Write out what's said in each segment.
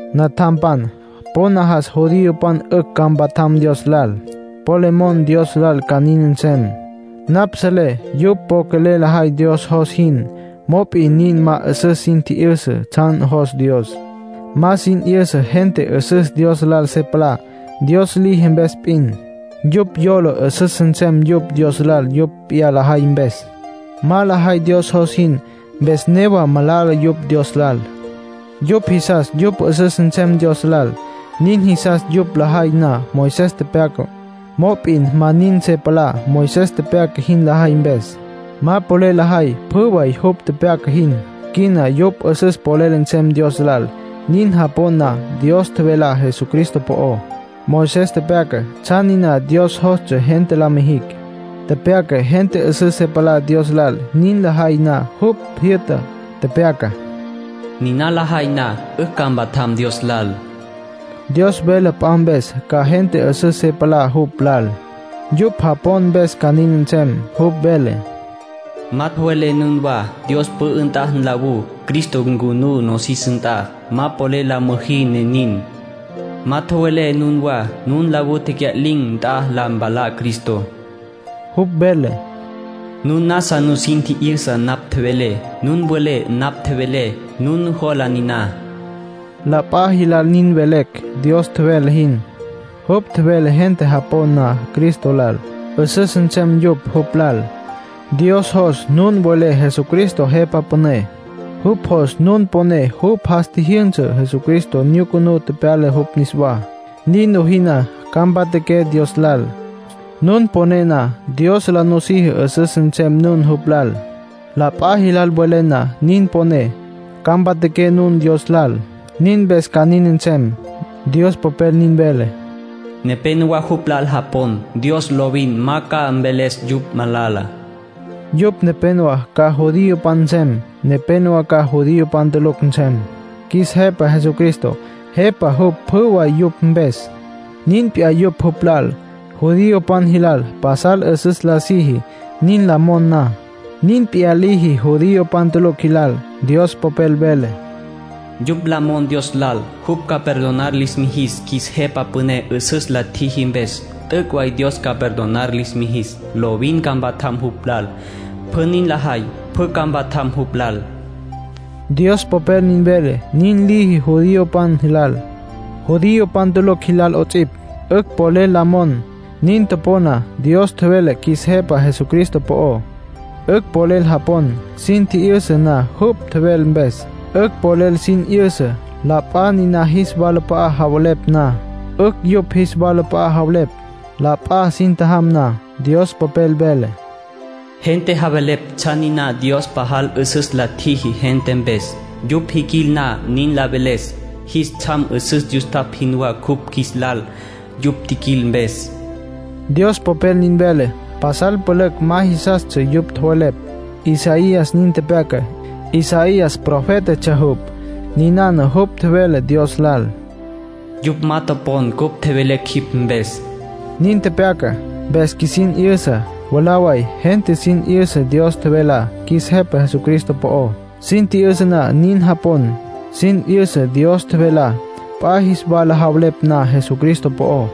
Natjampan, po najas judiopan 'ücj ca mpatjam Dios lal. Po le mon Dios lal ca nin nsem. Napj selé yupj po quelel lajay Dios jos jin. Mop'in nin ma 'üsüs sin tji'yüsa tsjan jos Dios. Ma sin 'yüsa gente 'üsüs Dios lal se palá, Dios liji mpes p'in. Yupj yola 'üsüs nsem yupj Dios lal yupj p'iyá lajay mpes. Ma lajay Dios jos jin, mpes newa malala yupj Dios lal. Yupj jisas yupj 'üsüs nsem Dios lal. Nin jisas yupj lajay na Moisés tepyacá. Mop'in ma nin se palá Moisés tepyaca jin lajay mpes; ma polel lajay pjü way jupj tepyaca jin. Quina yupj 'üsüs polel nsem Dios lal nin japon na Dios tjevelá Jesucristo po'ó. Moisés tepyaca tsjan niná Dios jostsja gente la mijicj. Tepyaca gente 'üsüs se palá Dios lal nin lajay na jupj tjijyü'tá. Tepyaca: “Niná lajay na, 'ücj ca mpatjam Dios lal”. Dios vele p'a mpes ca gente 'üsüs se palá jupj lal; yupj japon mpes ca nin nsem. Jupj vele: “Ma tjowelé nunwá Dios pü'ü nt'a nlawú Cristo ncunú nosis nt'a. Ma polel la müjí ne nin. Ma tjowelé nunwá nun nlawú tecya'lin̈ nt'a la mpalá Cristo.” Jupj vele: “Nun nasa nusin tji'yüsa napj tjevelé. Nun welé napj tjevelé. Nun nujola niná.” La p'a jilal nin velecj Dios tjevele jin. Jupj tjevele gente japon na Cristo lal, 'üsüs nsem yupj jupj lal. Dios jos nun welé Jesucristo Jepa Püné. Jupj jos nun poné jupj jas tjijyünsa Jesucristo, nyucunú tepyala jupj niswá. Nin lojí na, ca mpatjaqué Dios lal. Nun poné na, Dios la nusiji 'üsüs nsem nun jupj lal. La p'a jilal welé na nin poné, ca mpatjaqué nun Dios lal. Nin mpes ca nin nsem. Dios Popel nin vele: “Nepénowa jupj lal japon. Dios lovin ma ca mveles yupj malala”. Yupj nepénowa ca judiopan nsem. Nepénowa ca judiopan tulucj nsem. Qjuis Jepa Jesucristo Jepa jupj pjü way yupj mpes. Nin p'iyá yupj jupj lal. Judiopan jilal pasal 'üsüs la siji, nin la mon na. Nin p'iyá liji judiopan tulucj jilal. Dios Popel vele: “Yupj la mon Dios lal jupj ca perdonar lis mijis qjuis Jepa Püné 'üsüs la tjiji mpes, t'üc' way Dios ca perdonar lis mijis. Lovin ca mpatjam jupj lal. Pjü nin lajay, pjü ca mpatjam jupj lal”, Dios Popel nin vele. Nin liji judiopan jilal, judiopan tulucj jilal 'ots'ipj. 'Ücj polel la mon, nin topon na Dios tjevele qjuis Jepa Jesucristo po'ó. 'Ücj polel japon, sin tji'yüsa na jupj tjevele mpes. 'Ücj polel sin 'yüsa, la p'a niná jis walap'a'a javelepj na. 'Ücj yupj jis walap'a'a javelepj, la p'a sin tjajam na. Dios Popel vele: “Gente javelepj tsjan niná Dios pajal 'üsüs la tjiji gente mpes. Yupj jiquil na nin la veles, jis tsjam 'üsüs yustapj jinwá cupj qjuis lal yupj tjiquil mpes.” Dios Popel nin vele. Pasal pülücj ma jisastsja yupj tjowelepj. Isaías nin tepyaca. Isaías profétatsja jupj. Ninana jupj tjevele Dios lal: “Yupj ma topon cupj tjevelecj jipj mpes”, nin tepyaca. Mpes qjuisin 'yüsa, mwalá way gente sin 'yüsa Dios tjevelá qjuis Jepa Jesucristo po'ó. Sin tji'yüsa na nin japon. Sin 'yüsa Dios tjevelá, p'a jis wala javelepj na Jesucristo po'ó.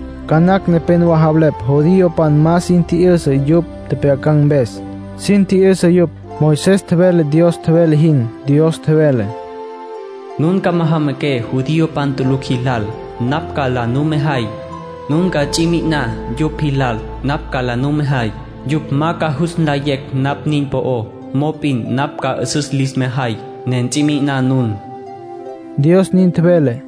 Ca nacj nepénowa javelepj judiopan ma sin tji'yüsa yupj tjepjyacan̈ mpes. Sin tji'yüsa yupj. Moisés tjevele Dios tjevele jin. Dios tjevele: “Nun ca majamaqué judiopan tulucj jilal, napj ca la numejay. Nun ca ts'i mi'iná yupj jilal, napj ca la numejay. Yupj ma ca jus nlayecj napj nin po'ó, mop'in napj ca 'üsüs lis mejay, ne ts'i mi'iná nun.” Dios nin tjevele.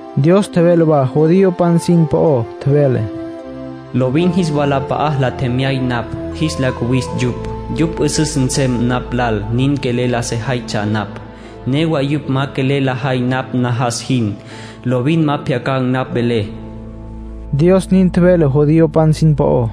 Dios tjevele wa judiopan sin po'ó. Tjevele: “Lovin jis walap'a'a la tjemyay napj, jis la cuwis yupj. Yupj 'üsüs nsem napj lal nin quelel la sejaytsja napj. Newa yupj ma quelel lajay napj najas jin. Lovin ma pjyacan̈ napj velé.” Dios nin tjevele judiopan sin po'ó.